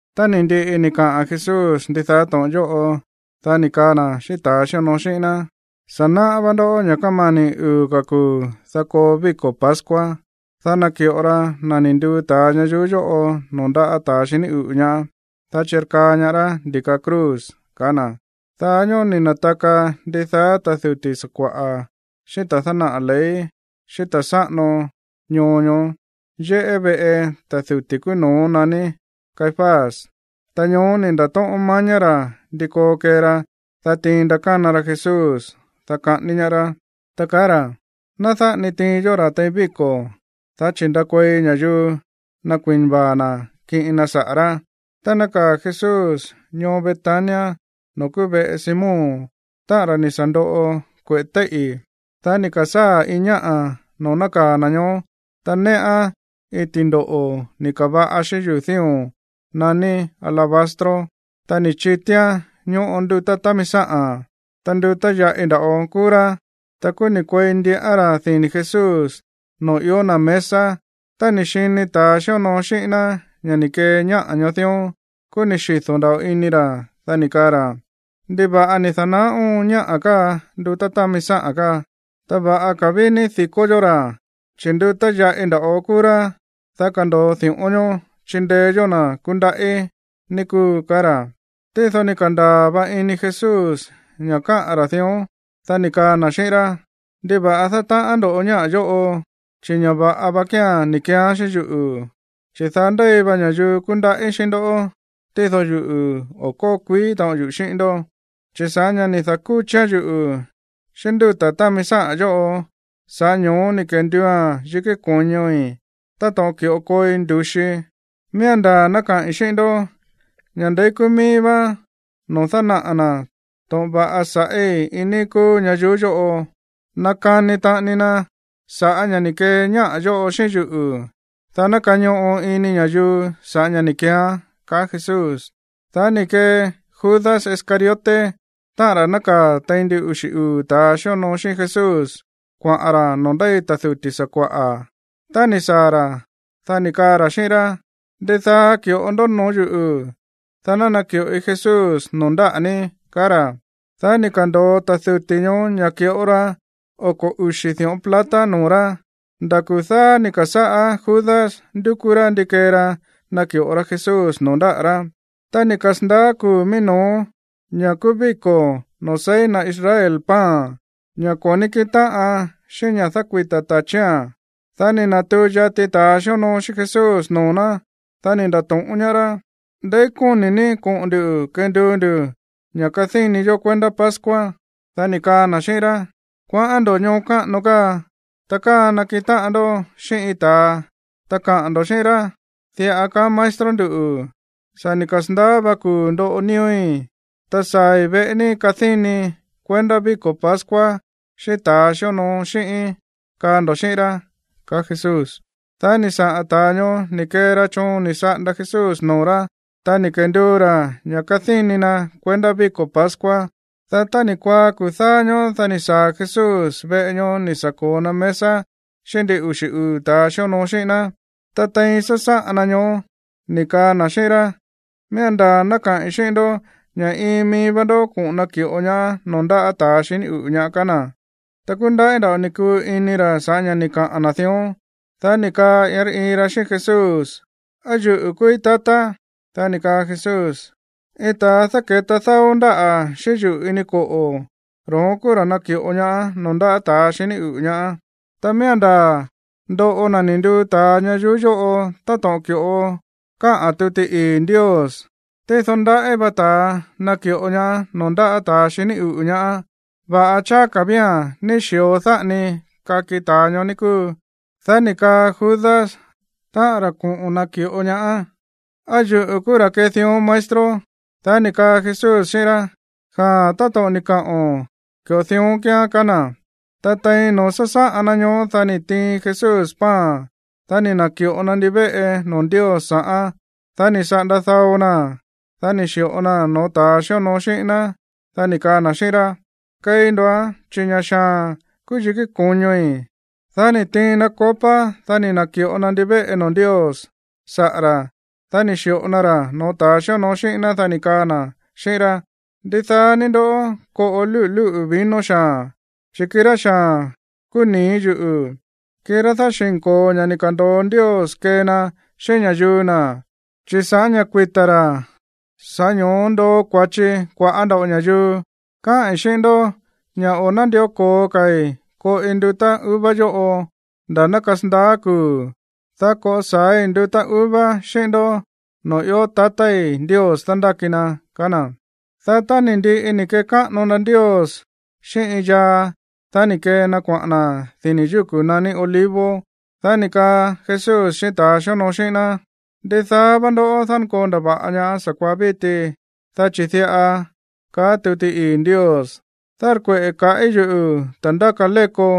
Tá ni̱ ndiꞌi ni̱ kaꞌa̱n Jesús ndidaá to̱ꞌon yóꞌo, dá ni̱ kaa na̱ xíꞌín ta̱ xíonoo xíꞌín ná: ―Sa̱ náꞌá vá ndó ña̱ kámani̱ uu̱ ka̱ kuu̱, dá koo víko̱ pascua, dá naki̱ꞌo ra na̱ ni̱ nduu ta̱a ñayuú yóꞌo noo̱ ndáꞌa̱ ta̱ xiní uꞌu̱ ñaá, dá chirkaa ñaá rá ndi̱ka cruz ―kaá na̱. Daá ñóó ni̱ na̱taka ndidaá ta̱ duti̱ sakua̱ꞌa̱ xíꞌín ta̱ dánaꞌa̱ ley xíꞌín ta̱ sáꞌano ñoo ñoó yéꞌé veꞌe ta̱ duti̱ kúú no̱ó naní Caifás. Ta ñoó ni̱ nda̱tóꞌón mañá ra̱ ndi koo kee ra, dá tiin ndakána ra Jesús, dá kaꞌání ñaá rá, ta kaá ra̱: ―Ná dáꞌa ni tiin yó ra̱ tein víko̱, dá chi̱ ndakuei ña̱yuu nakui̱na vaa̱ na̱ kiꞌin na saꞌa̱ rá. Tá nákaa̱ Jesús ñoo Betania noo̱ kúú veꞌe Simón, táꞌa̱n ra̱ ni̱ sa̱ ndoꞌo kueꞌe̱ téíꞌi̱, dá ni̱ ka̱sáa̱ iin ñáꞌa̱ noo̱ nákaa̱ na̱ ñoó, ta néꞌán iin ti̱ndoꞌo̱ ni̱ ka̱va̱ꞌa xíꞌín yuu̱ dío̱n naní alabastro. Ta ni̱ chitíán ñóꞌo ndutá támi sáꞌa̱n, ta ndutá yaꞌi nda̱ꞌo kúú rá. Ta kúú ni̱ kuei ndiꞌán ra̱ dini̱ Jesús noo̱ ió na̱ mesa. Tá ni̱ xini ta̱a xíonoo xíꞌín ná ña̱ ni̱ kee ñáꞌa̱ ñoó dión, kúú ni̱ xido̱ nda̱ꞌo ini ra̱, dá ni̱ kaa ra̱: ―¿Ndiva̱ꞌa ni̱ da̱naá óon ñáꞌa̱ káa ndutá támi sáꞌa̱n káa? Ta va̱ꞌa ka̱ ví ní di̱kó yó ra̱, chi̱ ndutá yaꞌi nda̱ꞌo kúú rá, ta kando̱o di̱ꞌón ñoó chindeé yó na̱ kúndaꞌí, ní kúu ―kaá ra̱. Tído ni̱ ka̱ndaa̱ va ini Jesús ña̱ káꞌa̱n ra̱ dión, dá ni̱ kaa na̱ xíꞌín rá: ―¿Ndiva̱ꞌa dátaꞌán ndo̱ ñáꞌa̱ yóꞌo? Chi̱ ña̱ va̱ꞌa va kía̱n ni̱ keeán xíꞌín yuꞌu̱. Chi̱ daá ndéi va ña̱yuu kúndaꞌí xíꞌín ndoꞌó, tído yuꞌu̱, o̱ kóo kuií taꞌon yuꞌu̱ xíꞌín ndó. Chi̱ sa̱ꞌá ña̱ ni̱ da̱kúchián yuꞌu̱ xíꞌín ndúta̱ támi sáꞌa̱n yóꞌo, sa̱ꞌá ño̱ó ni̱ kenduua̱n yikí ko̱ñoi̱ táto̱ꞌon ki̱ꞌo kooi ndu̱xii. Miía̱n ndaa̱ ná kaꞌi̱n xíꞌín ndó ña̱ ndeí kúú míí vá noo̱ dánaꞌa̱ na̱ to̱ꞌon va̱ꞌa sa̱ꞌí iin níí kúú ñayuú yóꞌo, nakani taꞌani na sa̱ꞌá ña̱ ni̱ kee ñáꞌa̱ yóꞌo xíꞌín yuꞌu̱, dá ná kañoꞌo ini ña̱yuu sa̱ꞌá ña̱ ni̱ keeán ―ka̱á Jesús. Dá ni̱ kee Judas Iscariote, táꞌa̱n ra̱ nákaa̱ tein ndin uxi̱ uu̱ ta̱a xíonoo xíꞌín Jesús, kuaꞌa̱n ra̱ noo̱ ndéi ta̱ duti̱ sakua̱ꞌa̱. Tá ni̱ saa̱ ra̱, dá ni̱ kaa ra̱ xíꞌín rá: ―¿Ndidaá ki̱ꞌo ní noo̱ yúꞌu̱, dá ná naki̱ꞌoi Jesús noo̱ ndáꞌa̱ ní? ―kaá ra̱. Dá ni̱ ka̱ndo̱o ta̱ duti̱ ñoó ña̱ ki̱ꞌo ra oko̱ uxi̱ di̱ꞌón plata noo̱ rá. Nda̱ kuu̱ dáá ni̱ ka̱sáꞌá Judas ndúkú rá ndi kee ra naki̱ꞌo ra Jesús noo̱ ndáꞌa̱ rá. Tá ni̱ kasa̱ndaá kuu̱ mií no̱ó, ña̱ kúú víko̱ noo̱ seí na̱ Israel pan, ña̱ ko̱ ní kíꞌin táꞌan xíꞌín ña̱ dákuita̱ ta̱chía̱n, dá ni̱ na̱tuu yati ta̱ xíonoo xíꞌín Jesús noo̱ ná, dá ni̱ nda̱to̱ꞌón ñaá rá: ―¿Ndeí kóni̱ ní koꞌo̱n ndu̱ kenduu ndu̱ ña̱ kadíni yó kuendá pascua? Dá ni̱ kaa na̱ xíꞌín rá: ―Kuaꞌán ndo̱ ñoo káꞌano káa. Ta káa nakiꞌin táꞌan ndó xíꞌín iin ta̱a, ta kaꞌa̱n ndo̱ xíꞌín rá: “Diꞌa kaá maestro nduꞌu̱: Sa̱ ni̱ kasa̱ndaá vá kuu̱ ndoꞌo nío̱í, ta saa̱i̱ veꞌe ní kadínii kuendá víko̱ pascua xíꞌín ta̱ xíonoo xíꞌíín”, kaa ndo̱ xíꞌín rá ―kaá Jesús. Dá ni̱ saꞌa̱n ta̱a ñoó ni̱ kee ra choon ni̱ saꞌanda Jesús noo̱ rá, ta ni̱ kenduu ra̱ ña̱ kadíni na kuendá víko̱ pascua. Dá tá ni̱ kuaá kuu̱ dáá ñóó, dá ni̱ saa̱ Jesús veꞌe ñoó ni̱ sa̱ ko̱o na mesa xíꞌín ndin uxi̱ uu̱ ta̱a xíonoo xíꞌín ná. Ta tein sásáꞌan na ñoó, ni̱ kaa na̱ xíꞌín rá: ―Miía̱n ndaa̱ ná kaꞌi̱n xíꞌín ndó ña̱ iin mií vá ndoꞌó koꞌo̱n naki̱ꞌo ñaá noo̱ ndáꞌa̱ ta̱a xiní uꞌu̱ ñaá ―kaá na̱. Ta kúndaꞌí nda̱ꞌo ni̱ kuu ini ra̱ sa̱ꞌá ña̱ ni̱ kaꞌa̱n na̱ dión. Dá ni̱ kaa iin rá iin ra xíꞌín Jesús: ―¿Á yuꞌu̱ kúúí, tatá? Dá ni̱ kaa Jesús: ―Iin ta̱a dáke̱ta dáó ndáꞌa̱ xíꞌín yuꞌu̱ ini koꞌo̱, ro̱ón kúú ra̱ naki̱ꞌo ñaá noo̱ ndáꞌa̱ ta̱a xiní uꞌu̱ ñaá. Ta miía̱n ndaa̱ ndoꞌo na̱ ni̱ nduu ta̱a ñayuú yóꞌo táto̱ꞌon ki̱ꞌo káꞌa̱n tuti ii̱ Ndios. Tído, ¡ndaꞌí va ta̱a naki̱ꞌo ñaá noo̱ ndáꞌa̱ ta̱ xiní uꞌu̱ ñaá! Va̱ꞌa cháá ka̱ vía̱n ní xi̱o dáꞌa ni kaki ta̱a ñoó, ní kúu. Dá ni̱ kaa Judas, táꞌa̱n ra̱ koꞌo̱n naki̱ꞌo ñaá: ―¿Á yuꞌu̱ kúú ra̱ kee dión, maestro? Dá ni̱ kaa Jesús xíꞌín rá: ―Jaa̱n, táto̱ꞌon ni̱ kaꞌo̱n, ki̱ꞌo dión kíán ―kaá na̱. Ta tein noo̱ sásáꞌan na ñoó, dá ni̱ tiin Jesús pan. Dá ni̱ na̱ki̱ꞌo na ndivéꞌe noo̱ Ndios sa̱ꞌán. Dá ni̱ saꞌanda dáó na̱án, dá ni̱ xi̱ꞌo naa̱n no̱ó ta̱ xíonoo xíꞌín ná. Dá ni̱ kaa na̱ xíꞌín rá: ―Keí ndo̱án, chi̱ ña̱ xaa̱n kúú yikí ko̱ñoi̱. Dá ni̱ tiin na copa. Dá ni̱ na̱ki̱ꞌo na ndivéꞌe noo̱ Ndios saꞌa̱ ra̱, dá ni̱ xi̱ꞌo na ra̱ noo̱ ta̱ xíonoo xíꞌín ná. Dá ni̱ kaa na̱ xíꞌín rá: ―Ndidaá ní ndó koꞌo lúꞌu̱ lúꞌu̱ vino xaa̱n, chi̱ kirá xaa̱n kúú nii̱ yuꞌu̱, kirá dáxi̱nko̱o ña̱ ni̱ ka̱ndo̱o Ndios kee na xíꞌín ña̱yuu na̱, chi̱ sa̱ꞌá ña̱ kuita̱ ra̱, sa̱ꞌá ño̱ó ndoo kua̱chi kua̱ꞌá nda̱ꞌo ña̱yuu. Káꞌi̱n xíꞌín ndó ña̱ o̱ nándió ko̱o ka̱i̱ koꞌi ndutá uva yóꞌo nda̱ ná kasandaá kuu̱, dá koꞌo sa̱ái̱ ndutá uva xíꞌín ndó noo̱ ió tatái̱ Ndios dándáki na ―kaá na̱. Dá tá ni̱ ndiꞌi ni̱ kekáꞌano na Ndios xíꞌín iin yaa, dá ni̱ kee na kuaꞌa̱n na̱ dini̱ yúku̱ naní Olivos. Dá ni̱ kaa Jesús xíꞌín ta̱ xíonoo xíꞌín ná: ―Ndidaá vá ndoꞌó dánkoo ndava̱ꞌa ñaá sa̱kuaá víti, dá chi̱ diꞌa kaá tuti ii̱ Ndios: “Dárkueꞌe̱ kaꞌí yuꞌu̱ ta̱ ndáka léko,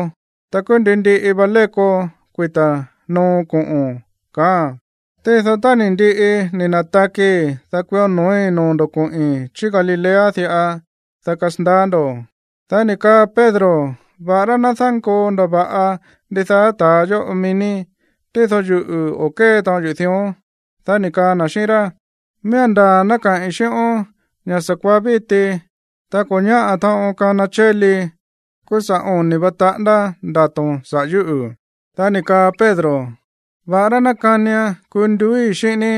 ta kúú ndi ndiꞌi va léko kuita̱ noo koꞌo̱n”, kaáa̱n. Tído tá ni̱ ndiꞌi ni̱ na̱takii̱, dá kuió no̱ói̱ noo̱ ndo̱ koꞌi̱n chí Galilea diꞌa, dá kasandaá ndo̱. Dá ni̱ kaa Pedro: ―Va̱ꞌará ná dánkoo ndava̱ꞌa ndidaá ta̱a yóꞌo mií ní, tído yuꞌu̱, o̱ kée taꞌon yuꞌu̱ dión. Dá ni̱ kaa na̱ xíꞌín rá: ―Miía̱n ndaa̱ ná kaꞌi̱n xíꞌón ña̱ sa̱kuaá víti, tá ko̱ ñáꞌa̱ taꞌon kana chéli, kúú sa̱ oni̱ va taꞌándá ndato̱n saꞌa̱ yúꞌu̱. Dá ni̱ kaa Pedro: ―Va̱ꞌará ná kánian kuu nduúi̱ xíꞌín ní,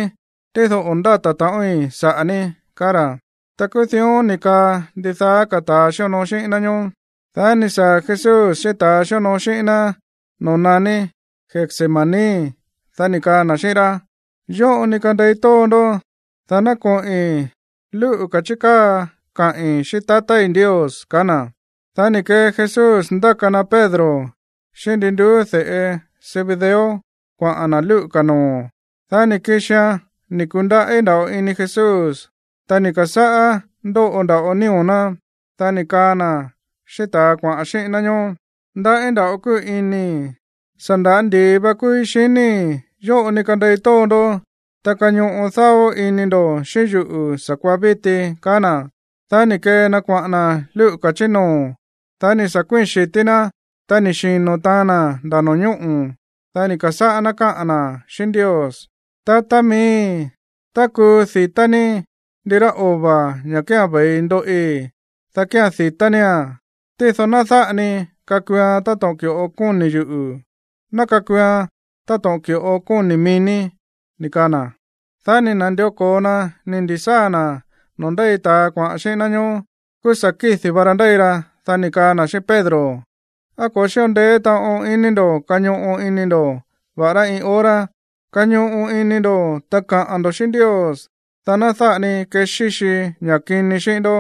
tído o̱ ndáta̱ taꞌoin saꞌa̱ ní ―kaá ra̱. Ta kúú dión ni̱ kaꞌa̱n ndidaá ka̱ ta̱ xíonoo xíꞌín ná ñóó. Dá ni̱ saa̱ Jesús xíꞌín ta̱a xíonoo xíꞌín ná noo̱ naní Getsemaní. Dá ni̱ kaa na̱ xíꞌín rá: ―Yóꞌo ni kandei tóo ndó, dá ná koꞌi̱n lúꞌu̱ ka̱ chí káa kaꞌi̱n xíꞌín Ndios ―ka̱á na̱. Dá ni̱ kee Jesús ndáka na Pedro xíꞌín ndi nduú de̱ꞌe Zebedeo kuaꞌa̱n na̱ lúꞌu̱ ka̱ noo̱. Dá ni̱ kixian ni̱ ku̱ndaꞌí nda̱ꞌo ini Jesús, ta ni̱ ka̱sáꞌá ndóꞌo nda̱ꞌo nío̱ ná. Dá ni̱ kaa na̱ xíꞌín ta̱a kuaꞌa̱n xíꞌín ná ñoó: ―Ndaꞌí nda̱ꞌo kúu inii̱. Sa̱ nda̱á ndi̱i va kúúí xiníi̱. Yóꞌo ni kandei tóo ndó, ta kañoꞌo dáó ini ndo̱ xíꞌín yuꞌu̱ sa̱kuaá víti ―kaá na̱. Dá ni̱ kee na kuaꞌa̱n na̱ lúꞌu̱ ka̱ chí noo̱. Dá ni̱ sa̱ kuíi̱n xi̱tí ná, ta ni̱ xino̱ taan na̱ nda̱ no̱ñóꞌo̱. Dá ni̱ ka̱sáꞌá ná káꞌa̱n na̱ xíꞌín Ndios: ―Tatá miíi̱, tá kuu di̱tá ní ndirá ova̱, ña̱ kía̱n ve̱i ndoꞌi, dá kía̱n di̱tá nía̱n. Tído ná dáꞌa ni kakuuan táto̱ꞌon ki̱ꞌo kóni̱ yuꞌu̱. Ná kakuuan táto̱ꞌon ki̱ꞌo kóni̱ mií ní ―kaá na̱. Dá ni̱ na̱ndió ko̱o na ni̱ ndi̱sáa̱ na̱ no̱ó ndéi ta̱a kuaꞌa̱n xíꞌín ná ñoó, kúú sa̱ kídi̱ va ra ndéi ra. Dá ni̱ kaa na̱ xíꞌín Pedro: ―¿Á ko̱ xíꞌo ndeé taꞌon ini ndo̱ kañoꞌo ini ndo̱, va̱ꞌará iin hora? Kañoꞌo ini ndo̱, ta kaꞌa̱n ndo̱ xíꞌín Ndios, dá ná dáꞌa ni kexíxi ña̱ kini xíꞌín ndó.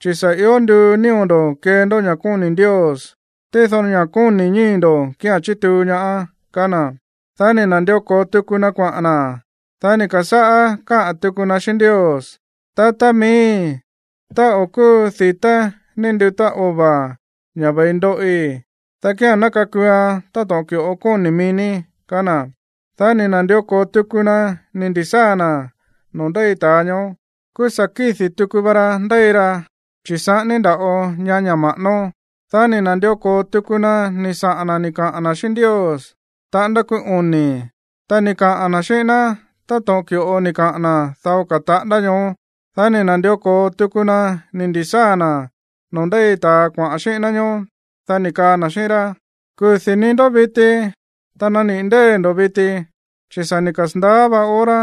Chi̱ sa̱ ió nduu nío̱ ndo̱ kee ndó ña̱ kóni̱ Ndios, tído ña̱ kóni̱ ñíi̱ ndo̱ kía̱n chítuu ñaá ―kaá na̱. Dá ni̱ na̱ndió ko̱o tuku na kuaꞌa̱n na̱. Dá ni̱ ka̱sáꞌá káꞌa̱n tuku na xíꞌín Ndios: ―Tatá miíi̱, tá o̱ kúu di̱tá ní ndutá ova̱, ña̱ ve̱i ndoꞌi, dá kía̱n ná kakuuan táto̱ꞌon ki̱ꞌo kóni̱ mií ní ―kaá na̱. Dá ni̱ na̱ndió ko̱o tuku na ni̱ ndi̱sáa̱ na̱ noo̱ ndéi ta̱a ñoó. Kúú sa̱ kídi̱ tuku va ra ndéi ra, chi̱ saꞌání nda̱ꞌo ñaá ña̱ ma̱ꞌánó. Dá ni̱ na̱ndió ko̱o tuku na ni̱ saꞌa̱n na̱ ni̱ kaꞌa̱n na̱ xíꞌín Ndios taꞌándá kúú oni̱, ta ni̱ kaꞌa̱n na̱ xíꞌín ná táto̱ꞌon ki̱ꞌo ni̱ kaꞌa̱n na̱ dao ka̱ taꞌándá ñoó. Dá ni̱ na̱ndió ko̱o tuku na ni̱ ndi̱sáa̱ na̱ noo̱ ndéi ta̱a kuaꞌa̱n xíꞌín ná ñoó, dá ni̱ kaa na̱ xíꞌín rá: ―¡Kudi̱ ní ndó viti! ¡Ta naniꞌi̱ ndée̱ ndo̱ viti! Chi̱ sa̱ ni̱ kasa̱ndaá vá hora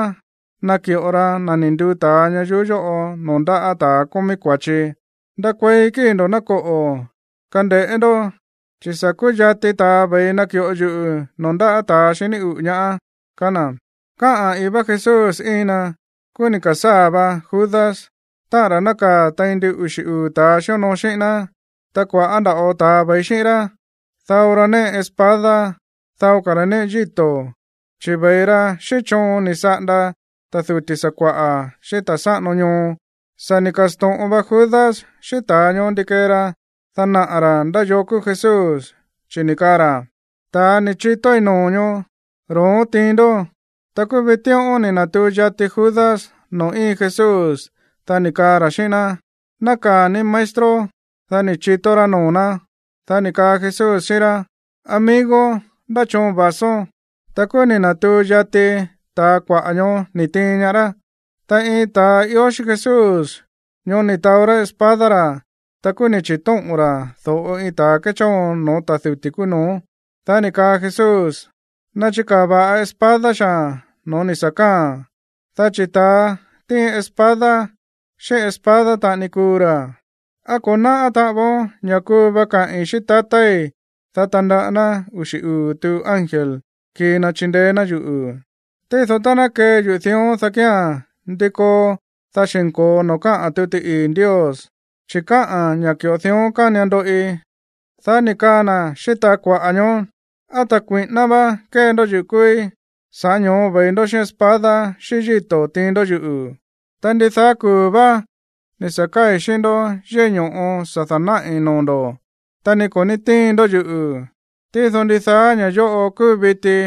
naki̱ꞌo ra na̱ ni̱ nduu ta̱a ñayuú yóꞌo noo̱ ndáꞌa̱ ta̱a kómí kua̱chi. ¡Ndakuei kíi̱ ndo̱, ná koꞌo̱! Kande̱ꞌé ndó, chi̱ sa̱ kúyati ta̱a ve̱i naki̱ꞌo yuꞌu̱ noo̱ ndáꞌa̱ ta̱ xiní uꞌu̱ ñaá ―kaá na̱. Káꞌa̱n i̱í vá Jesús íin na, kúú ni̱ ka̱sáa̱ va Judas, táꞌa̱n ra̱ nákaa̱ tein ndin uxi̱ uu̱ ta̱a xíonoo xíꞌín ná. Ta kua̱ꞌá nda̱ꞌo ta̱a ve̱i xíꞌín rá. Dao ra néꞌe espada, dao ka̱ ra̱ néꞌe yíto̱. Chi̱ ve̱i ra xíꞌín choon ni̱ saꞌanda ta̱ duti̱ sakua̱ꞌa̱, xíꞌín ta̱ sáꞌano ñoo. Sa̱ ni̱ ka̱sto̱ꞌon va Judas xíꞌín ta̱a ñoó ndi kee ra, dá naꞌa̱ ra̱ ndá yoo kúú Jesús, chi̱ ni̱ kaa ra̱: ―Ta̱a ni̱ chitóí noo̱ ñoó, ro̱ón tiin ndó. Ta kúú vitíꞌón ni̱ na̱tuu yati Judas noo̱ íin Jesús, dá ni̱ kaa ra̱ xíꞌín ná: ―Nákaa̱ ní, maestro. Dá ni̱ chitó rá noo̱ ná. Dá ni̱ kaa Jesús xíꞌín rá: ―Amigo, ¿ndá choon va̱són? Ta kúú ni̱ na̱tuu yati ta̱a kuaꞌa̱ ñoó ni̱ tiin ñaá rá. Ta iin ta̱a ió xíꞌín Jesús ñoó ni̱ taó rá espada ra̱. Ta kúú ni̱ chi̱tóꞌo̱n ra̱ do̱ꞌo iin ta̱ kéchóon no̱ó ta̱ duti̱ kúú no̱ó. Dá ni̱ kaa Jesús: ―Nachikaa̱ va̱ꞌa espada xaa̱n no̱ó ni̱ sa̱ káa̱a̱n, dá chi̱ ta̱a tíin espada, xíꞌín espada taꞌani kuu ra̱. ¿Á ko̱ náꞌá taꞌan voon ña̱ kuu va kaꞌi̱n xíꞌín tatái̱, dá tandaꞌá ná uxi̱ uu̱ tuꞌu ángel kii na chindeé ná yuꞌu̱? Tído tá ná kee yuꞌu̱ dión, dá kía̱n, ¿ndi koo, dá xi̱nko̱o noo̱ káꞌa̱n tuti ii̱ Ndios? Chi̱ káꞌa̱n ña̱ ki̱ꞌo dión kánian ndoꞌi. Dá ni̱ kaa na̱ xíꞌín ta̱a kuaꞌa̱ ñoó: ―¿Á ta̱ kui̱ꞌíná vá kée ndó yuꞌu̱ kúúí, sa̱ꞌá ño̱ó ve̱i ndó xíꞌín espada xíꞌín yíto̱ tiin ndó yuꞌu̱? Ta ndidaá kuu̱ vá ni̱ sa̱ káa̱i̱ xíꞌín ndó yéꞌé ño̱ꞌo sa̱ da̱náꞌi̱ noo̱ ndo̱, ta ni ko̱ ní tíin ndó yuꞌu̱. Tído ndidaá ña̱ yóꞌo kúu viti,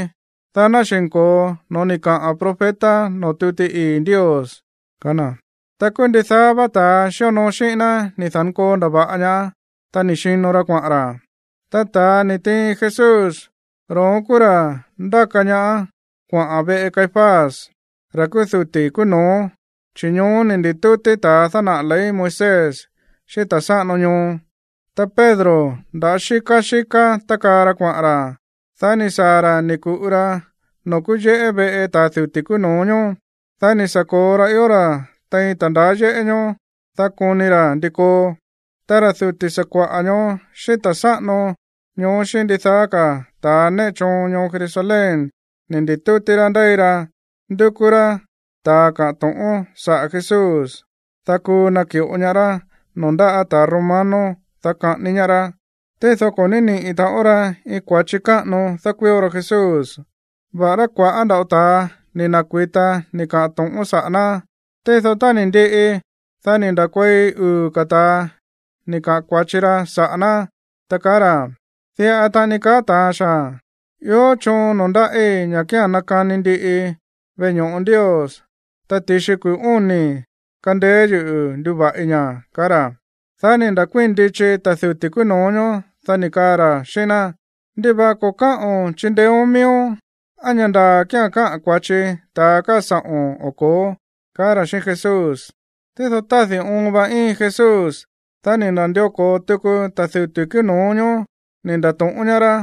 dá ná xi̱nko̱o no̱ó ni̱ kaꞌa̱n profeta noo̱ tuti ii̱ Ndios ―kaá na̱. Ta kúú ndidaá vá ta̱ xíonoo xíꞌín ná ni̱ da̱nkoo ndava̱ꞌa ñaá, ta ni̱ xino ra kuaꞌa̱n ra̱. Ta ta̱a ni̱ tiin Jesús, ro̱ón kúú ra̱ ndáka ñaá kuaꞌa̱n veꞌe Caifás, ra̱ kúú duti̱ kúú no̱ó, chi̱ ñoó ni̱ ndi̱tútí ta̱a dánaꞌa̱ ley Moisés xíꞌín ta̱ sáꞌano ñoo. Ta Pedro, nda̱á xíká xíká tákaa ra kuaꞌa̱n ra̱. Dá ni̱ saa̱ ra̱ ni̱ ku̱ꞌu ra noo̱ kúú yéꞌé veꞌe ta̱ duti̱ kúú no̱ó ñóó. Dá ni̱ sa̱ ko̱o ra ió ra̱ tein ta̱ ndaá yéꞌé ñoó, dá koni ra̱ ndi koo. Ta ra̱ duti̱ sakua̱ꞌa̱ ñoó xíꞌín ta̱ sáꞌano ñoó xíꞌín ndidaá ka̱ ta̱ néꞌe choon ñoo Jerusalén ni̱ ndi̱tútí rá ndéi ra ndúkú rá ta̱ kaꞌa̱n to̱ꞌón saꞌa̱ Jesús, dá kuu naki̱ꞌo ñaá rá noo̱ ndaꞌá ta̱ romano, dá kaꞌání ñaá rá. Tído ko̱ ní niꞌi̱ taꞌon ra iin kua̱chi káꞌano dákuío ra Jesús, va̱ꞌará kua̱ꞌá nda̱ꞌo ta̱a ni̱ na̱kui̱ta ni̱ kaꞌa̱n to̱ꞌón saꞌa̱ ná. Tído tá ni̱ ndiꞌi, dá ni̱ nda̱kuei uu̱ ka̱ ta̱a ni̱ kaꞌa̱n kua̱chi ra saꞌa̱ ná, ta kaá ra̱: ―Diꞌa taꞌani ni̱ kaa ta̱a xaa̱n: “Ió choon noo̱ ndáꞌí ña̱ kía̱n nakani ndiꞌii veꞌe ño̱ꞌo Ndios, ta ti̱xi kuu̱ óni̱ kandeé yuꞌu̱ nduva̱ꞌi ña̱” ―ka̱á ra̱. Dá ni̱ nda̱kuíi̱n ndichi mií ta̱ duti̱ kúú no̱ó ñoó. Dá ni̱ kaa ra̱ xíꞌín ná: ―¿Ndiva̱ꞌa ko̱ káꞌo̱n chindeéón miíón? ¿Á ña̱ ndaa̱ kía̱n káꞌa̱n kua̱chi ta̱a káa sa̱ꞌo̱n o ko̱ó? ―ka̱á ra̱ xíꞌín Jesús. Tído tádi̱ óon va íin Jesús. Dá ni̱ na̱ndió ko̱o tuku ta̱ duti̱ kúú no̱ó ñóó ni̱ nda̱to̱ꞌón ñaá rá: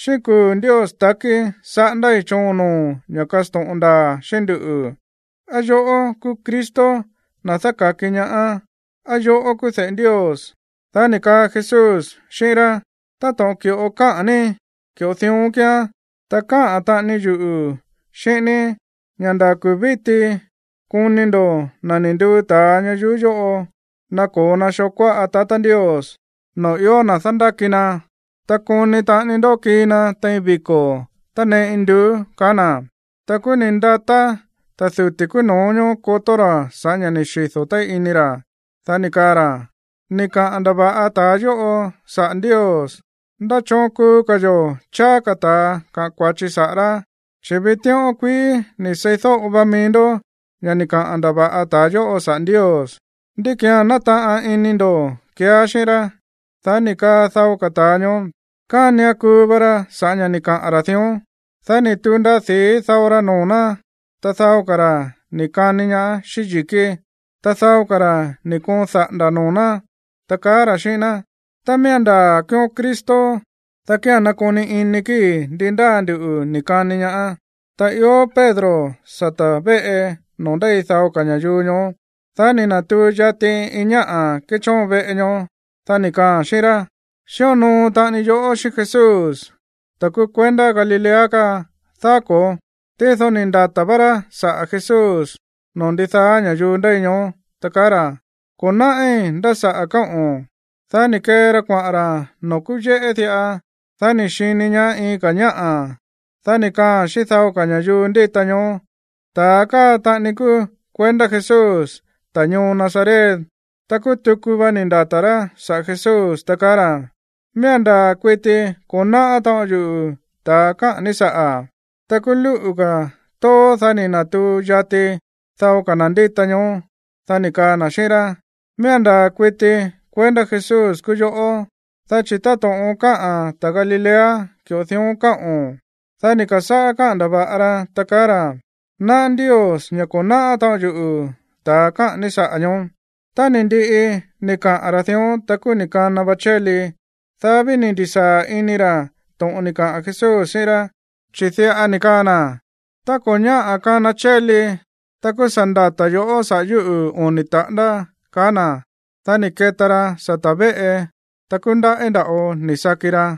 ―Xíꞌín kuu̱ Ndios ta̱kí saꞌándái̱ choon noo̱o̱n ña̱ kasto̱ꞌon ndaa̱ xíꞌín nduꞌu̱. ¿Á yoꞌó kúú Cristo, na̱ dáka̱ki ñaá? ¿Á yoꞌó kúú de̱ꞌe Ndios? Dá ni̱ kaa Jesús xíꞌín rá: ―Táto̱ꞌon ki̱ꞌo káꞌa̱n ní, ki̱ꞌo dión kíán. Ta káꞌa̱n taꞌani yuꞌu̱ xíꞌín ní ña̱ nda̱ kuu̱ víti koni ndo̱ na̱ ni̱ nduu ta̱a ñayuú yóꞌo nako̱o na xoo kuáꞌa tatá Ndios, noo̱ ió na̱ dándáki na. Ta koni taꞌani ndó kii na tein viko̱ tánee induú ―kaá na̱. Ta kúú ni̱ ndatá ta̱ duti̱ kúú no̱ó ñóó kotó ra̱ sa̱ꞌá ña̱ ni̱ xido̱ téí ini ra̱. Dá ni̱ kaa ra̱: ―¡Ni̱ kaꞌa̱n ndava̱ꞌa ta̱a yóꞌo saꞌa̱ Ndios! ¿Ndá choon kuu ka̱ yo̱ cháá ka̱ ta̱a kaꞌa̱n kua̱chi saꞌa̱ rá? Chi̱ vitíꞌón kuií ni̱ seídóꞌo va mií ndó ña̱ ni̱ kaꞌa̱n ndava̱ꞌa ta̱a yóꞌo saꞌa̱ Ndios. ¿Ndí ki̱án nátaꞌan ini ndo̱ keeá xíꞌín rá? Dá ni̱ kaa dao ka̱ ta̱a ñoó: ―Kánian kuu va ra sa̱ꞌá ña̱ ni̱ kaꞌa̱n ra̱ dión. Dá ni̱ tu̱u ndaa di̱í dao ra noo̱ ná, ta dao ka̱ ra̱ ni̱ kani ñaá xíꞌín yi̱kí, ta dao ka̱ ra̱ ni̱ koon daꞌa̱nda̱ noo̱ ná, ta kaá ra̱ xíꞌín ná: ―Tá miía̱n ndaa̱ kúúón Cristo, dá kía̱n nakoni ini kíi̱ ndi ndáa nduꞌu̱ ni̱ kani ñaá. Ta ió Pedro sata̱ véꞌe noo̱ ndéi dao ka̱ ña̱yuu ñoó. Dá ni̱ na̱tuu yati iin ñáꞌa̱ kéchóon veꞌe ñoó. Dá ni̱ kaaa̱n xíꞌín rá: ―Xíonoo taꞌani yoꞌó xíꞌín Jesús, ta̱ kúú kuendá Galilea káa, ¿daá ko̱ó? Tído ni̱ ndata̱ vá Pedro saꞌa̱ Jesús noo̱ ndidaá ña̱yuu ndéi ñoó, ta kaá ra̱: ―Ko̱ náꞌí nda̱ saꞌa̱ káꞌo̱n. Dá ni̱ kee ra kuaꞌa̱n ra̱ noo̱ kúú yéꞌé diꞌa. Dá ni̱ xini ñaá iin ka̱ ñáꞌa̱. Dá ni̱ kaaa̱n xíꞌín dao ña̱yuu ndíta ñoó: ―Ta̱a káa taꞌani kúú kuendá Jesús, ta̱ ñoo Nazaret. Ta kúú tuku va ni̱ ndata̱ rá saꞌa̱ Jesús, ta kaá ra̱: ―Miía̱n ndaa̱ kuiti ko̱ náꞌá taꞌon yuꞌu̱ ta̱a káꞌa̱n ní saꞌa̱. Ta kúú lúꞌu̱ ka̱ tóó, dá ni̱ na̱tuu yati dao ka̱ na̱ ndíta ñoó, dá ni̱ kaa na̱ xíꞌín rá: ―Miía̱n ndaa̱ kuiti kuendá Jesús kúú yoꞌó, dá chi̱ táto̱ꞌon káꞌa̱n ta̱ Galilea, ki̱ꞌo dión káꞌo̱n. Dá ni̱ ka̱sáꞌá káꞌa̱n ndava̱ꞌa ra, ta kaá ra̱: ―Náꞌá Ndios ña̱ ko̱ náꞌá taꞌon yuꞌu̱ ta̱a káꞌa̱n ní saꞌa̱ ñoó. Ta ni̱ ndiꞌi ni̱ kaꞌa̱n ra̱ dión, ta kúú ni̱ kana va chéli. Dá ví ni̱ ndi̱sáa̱ ini ra̱ to̱ꞌon ni̱ kaꞌa̱n Jesús xíꞌín rá, chi̱ diꞌa ni̱ kaa na̱: “Tá ko̱ ñáꞌa̱ kana chéli, ta kúú sa̱ ndata̱ yo̱ꞌó sa̱ꞌá yuꞌu̱ oni̱ taꞌándá”, kaá na̱. Dá ni̱ keta ra sata̱ véꞌe, ta kúú ndaꞌí nda̱ꞌo ni̱ saki ra.